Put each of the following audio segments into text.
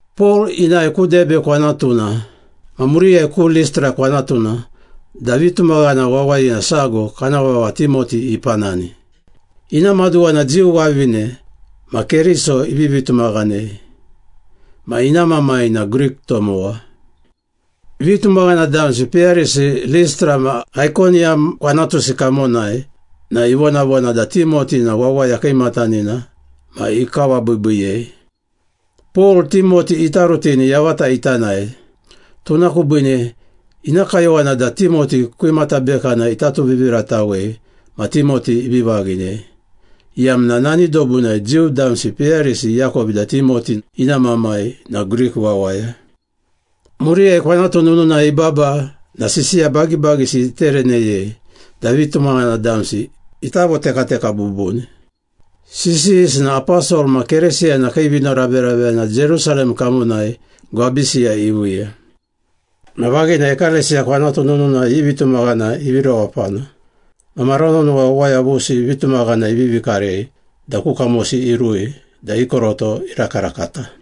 Pol inae ku Debe kwanatuna ma muriyai ku Listra kwanatuna da vitumaghana wawayina sago kana vava Timoti ipanani. Ina maduwa na Jiu wavine ma Keriso ivivi tumaghanei, ma ina mamai na Grik tomowa. Vitumaghana damsi peyarisi Listra ma Aikoniyam kwanatusi kamonai na ivonavona da Timoti na wawaya kiimatanina ma ikawabiibiiyei. Pol, Timoti ita rutini yavata ita nae, tuna kubiine ina kayowana da Timoti kwimata bekana ita tuviviratawei ma Timoti ivi vaghinei, iyamna nani dobunai Jiu damsi peyarisi iakovi da Timoti ina mamai na Grik wawaya. Muriyai kwanatu nununai ibaba na sisiya bagibagisi itereneyei da vitumaghana damsi ita votekateka bubuni. Sisiyisi na aposol ma Keresiyana kii vinoraveraveyana Jerusalem kamonai gwabisiyai iviiya. Ma vaghina ekalesiya kwanatu nununai i vitumaghana ivi rewapana, ma mara nonowa wawaya vusi vitumaghana ivivi karei da ku kamosi irui da i koroto irakarakata.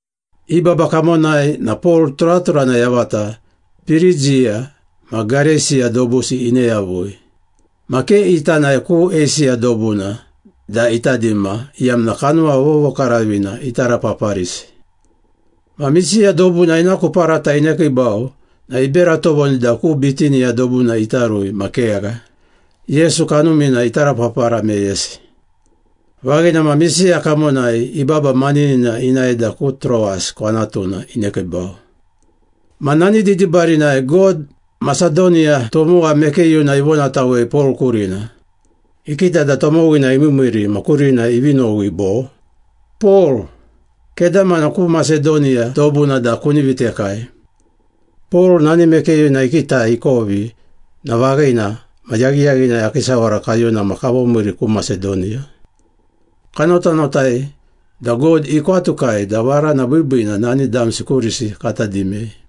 I baba kamonai na Pol turaturana yavata Pirigiya ma Gareisiya dobusi ine yavui. Ma ke ita nae ku Eisiya dobuna da ita dima, iyamna Kanuma Vovokaravina itarapaparisi. Ma Misiya dobuna ina ku parata inekiibau na ibera tovoni da ku Bitiniya dobuna ita rui ma kegha, Yesu Kanumina itarapapara meyesi. Vaghina ma Misiya kamonai ibaba maninina inae da ku Troas kwanatuna inekiibau. Ma nani didibarinai God Masedoniya tomowa mekeyuna ivonatawei Pol kurina. Ikita da tomowina imiimiiri ma kurina ivi nowi bo, “Pol, kedamana ku Masedoniya dobuna da kuni vitekai.” Pol nani mekeyuna ikitai ikovi na vaghina ma yaghiyaghinai akii sawara kayuna ma kavomiiri ku Masedoniya. Kanotanotai da God ikwatukai da varana biibiina nani damsi kurisi kata dimei.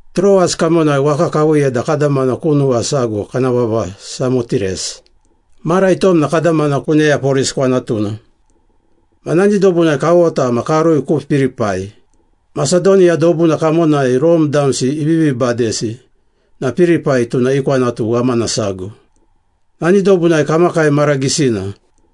Troas kamonai waka kaviiya da kadamana ku nuwa sago kana vava Samotires. Mara itom na kadamana ku Neyapolis kwanatuna. Ma nani dobunai kawota ma karui ku Pilipai. Masedoniya dobuna kamonai Rome damsi ivivi badesi na Pilipai tuna i kwanatu ghamana sago. Nani dobunai kamakai mara gisina.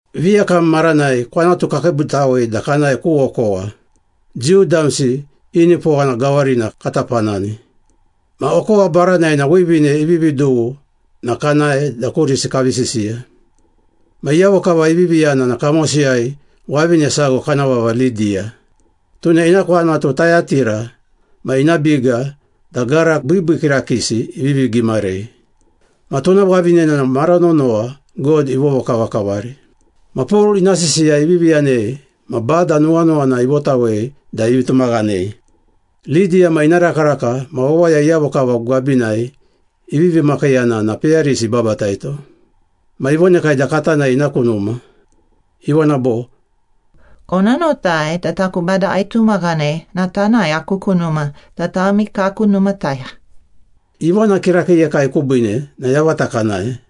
Viyakam maranai kwanatu kakiibutawei da kanae ku okowa. Jiu damsi i nipowana gawarina kata panani. Ma okowa baranai na wivine ivivi dughu na kanae da kurisi kavi sisiya. Ma iyavo kava ivivi yana na kamosiyai wavine sago kana vava Lidiya. Tuna ina kwanatu Tayatira ma ina biga da gara biibii kirakiisi ivivi gimarei. Ma tuna wavinena na mara nonowa God ivovokavakavari. Ma Pol ina sisiya ivivi yanei ma Bada nuwanuwana ivotawei da ivi tumaghanei. Lidiya ma ina rakaraka ma wawaya iyavo kava gwabinai ivivi makiiyana na peyarisi ibabataito. Ma ivonekai da kata nae ina ku numa. Ivona bo, “Kona notai da taku Bada aitumaghanei na tanae aku ku numa da tami kaku numataya.” Ivona kirakiiyekai kubiine na yavata kanae.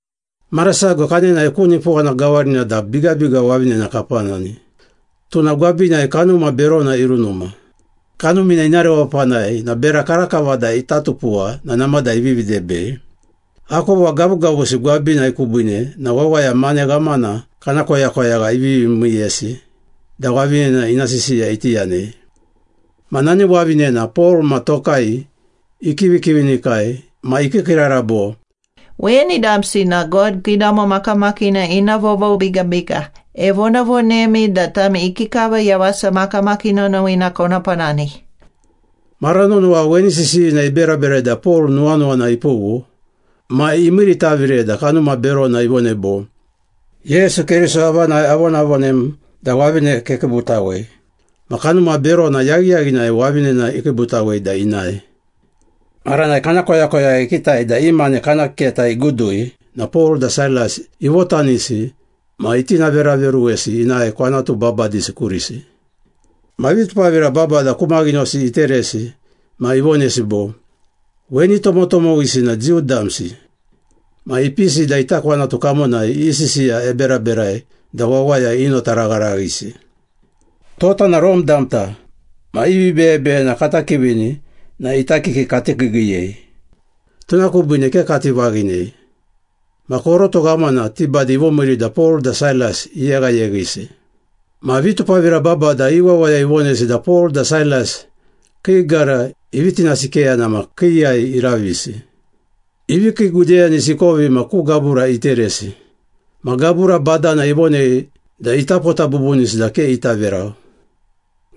Mara sago kanenae ku nipowana gawarina da bigabiga wavinena kapanani, tuna gwabinai kanuma berona irunuma. Kanumina ina rewapanai na bera karakava da ita tupuwa na namada ivivi debei. Akova gavugavusi gwabinai kubiine na wawaya mane ghamana kana koyakoyagha ivivi miiyesi da wavinena ina sisiya iti yanei. Ma nani wavinena Pol ma tokai ikivikivinikai ma ikiikiirara bo, “Weni damsi na God Kiidamo Makamakiina ina vovobigabiga. Evonavonemi da tami ikikava yawasa makamakii nonowina kona panani.” Mara nonowa weni sisiyina iberaberai da Pol nuwanuwana ipughu ma imiiritavire da kanuma berona ivonei bo, “Yesu Keriso avanai avonavonem da wavine kekiibutawei.” Ma kanuma berona yaghiyaghinai wavinena ikiibutawei da inae. Maranai kana koyakoyagha ikitai da i mane kana keta igudui na Pol da Sailas ivotanisi ma itinaveraveruwesi inae kwanatu babadisi kurisi. Ma vitupavira babada ku maghinosi iteresi ma ivonesi bo, “Weni tomotomowisi na Jiu damsi. Ma ipisi da ita kwanatu kamonai i sisiya eberaberai da wawaya inotaragharaghisi. Tota na Rome damta ma i vibeyebeyena kata kivini na ita kiki kati kiigiiyei, tuna kubiine ke kati vaghinei.” Ma koroto ghamana ti bade ivomiiri da Pol da Sailas iyeghayeghisi. Ma vitupavira babada i wawaya ivonesi da Pol da Sailas kii gara ivi tinasikeyana ma kiiyai iravisi. Ivi kiigudeyanesi ikovi ma ku gabura iteresi. Ma gabura badana ivonei da ita pota bubunisi da ke ita verau.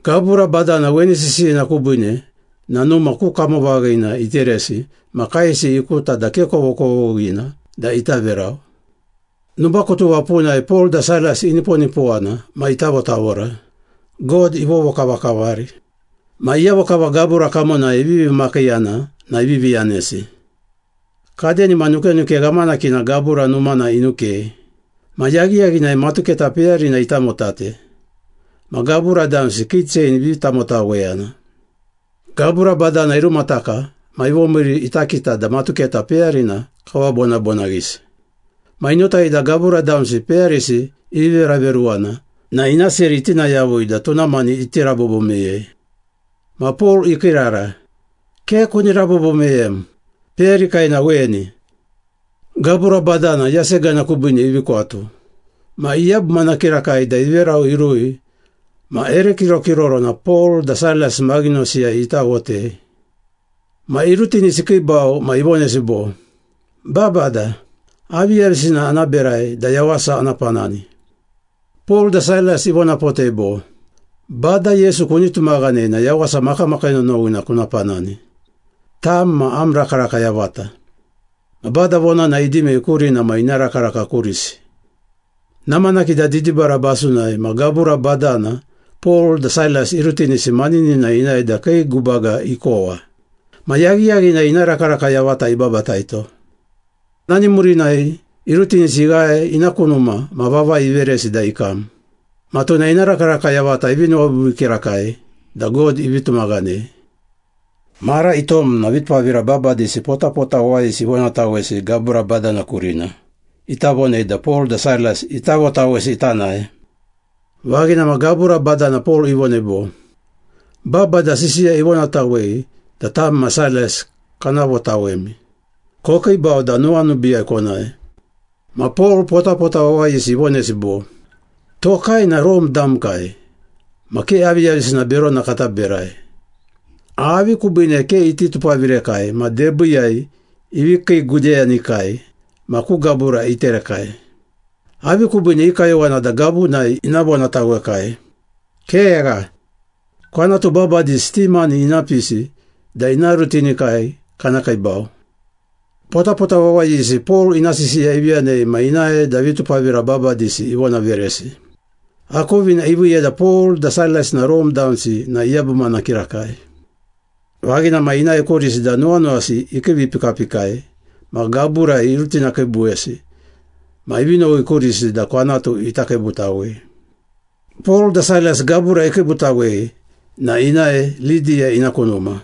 Gabura badana weni sisiyina kubiine na numa ku kamovaghina iteresi ma kaesi ikuta da ke kovokovoghina da ita verau. Nubakutuva punai Pol da Sailas iniponipowana ma itavotavora, God ivovokavakavari. Ma iyavo kava gabura kamonai ivivi makiiyana na ivivi yanesi. Kadenima nukenuke ghamanakina gabura numana inukei. Ma yaghiyaghinai matuketa peyarina itamotate, ma gabura damsi kii chein ivi tamotaweyana. Gabura badana irumataka ma ivomiiri ita kita da matuketa peyarina kawabonabonaghisi. Ma inotai da gabura damsi peyarisi ivi veraveruwana na ina seri itina yavui da tuna mani iti rabobo meyei. Ma Pol ikiirara, “Ke kuni rabobo meyem! Peyarikai na weni!” Gabura badana yasegana kubiine ivi kwatu. Ma iyabumana kirakai da iverau irui ma ere kirokirorona Pol da Sailas maghinosiyai itawotei. Ma irutinisi ikiibau ma ivonesi bo, “Babada, aviyavisina ana berai da yawasa ana panani?” Pol da Sailas ivonapotei bo, “Bada Yesu kuni tumaghanei na yawasa makamakii nonowina kuna panani. Tam ma am rakaraka yavata.” Ma Bada vonana idimei kurina ma ina rakaraka kurisi. Namanaki da didibara basunai ma gabura badana Pol da Sailas irutinisi maninina inae da kii gubaga ikowa. Ma yaghiyaghinai ina rakaraka yavata ibabataito. Nani murinai irutinisi ighae ina ku numa ma vavai iveresi da ikam. Ma tuna ina rakaraka yavata ivi nuwabiibii kirakai da God ivi tumaghanei. Mara itom na vitupavira babadisi potapota wawayisi ivonatawesi gabura badana kurina, ita vonei da Pol da Sailas ita votawesi ita nae. Vaghina ma gabura badana Pol ivonei bo, “Babada sisiya ivonatawei da tam ma Sailas kana votawemi. Kokiibau da nuwanubiiyai konae.” Ma Pol potapota wawayisi ivonesi bo, “Tokai na Rome damkai ma ke aviyavisina berona kata berai. Avi kubiine ke iti tupavirekai ma debiiyai ivi kiigudeyanekai ma ku gabura iterekai? Avi kubiine i kayowana da gavunai ina vonatawekai? Kegha! Kwanatu babadisi ti mani ina pisi da ina rutinikai kana kiibau.” Potapota wawayisi Pol ina sisiya ivi yanei ma inae da vitupavira babadisi ivonaveresi. Akovina iviiya da Pol da Sailas na Rome damsi na iyabumana kirakai. Vaghina ma inae kurisi da nuwanuwasi ikiivipikapikai ma gaburai irutinakiibuwesi ma ivi nowi kurisi da kwanatu ita kiibutawei. Pol da Sailas gabura ikiibutawei na inae Lidiya ina ku numa.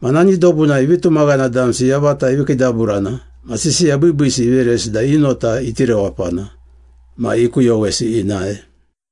Ma nani dobunai vitumaghana damsi yavata ivi kiidaburana ma sisiya biibiisi iveresi da i nota iti rewapana, ma ikuyowesi inae.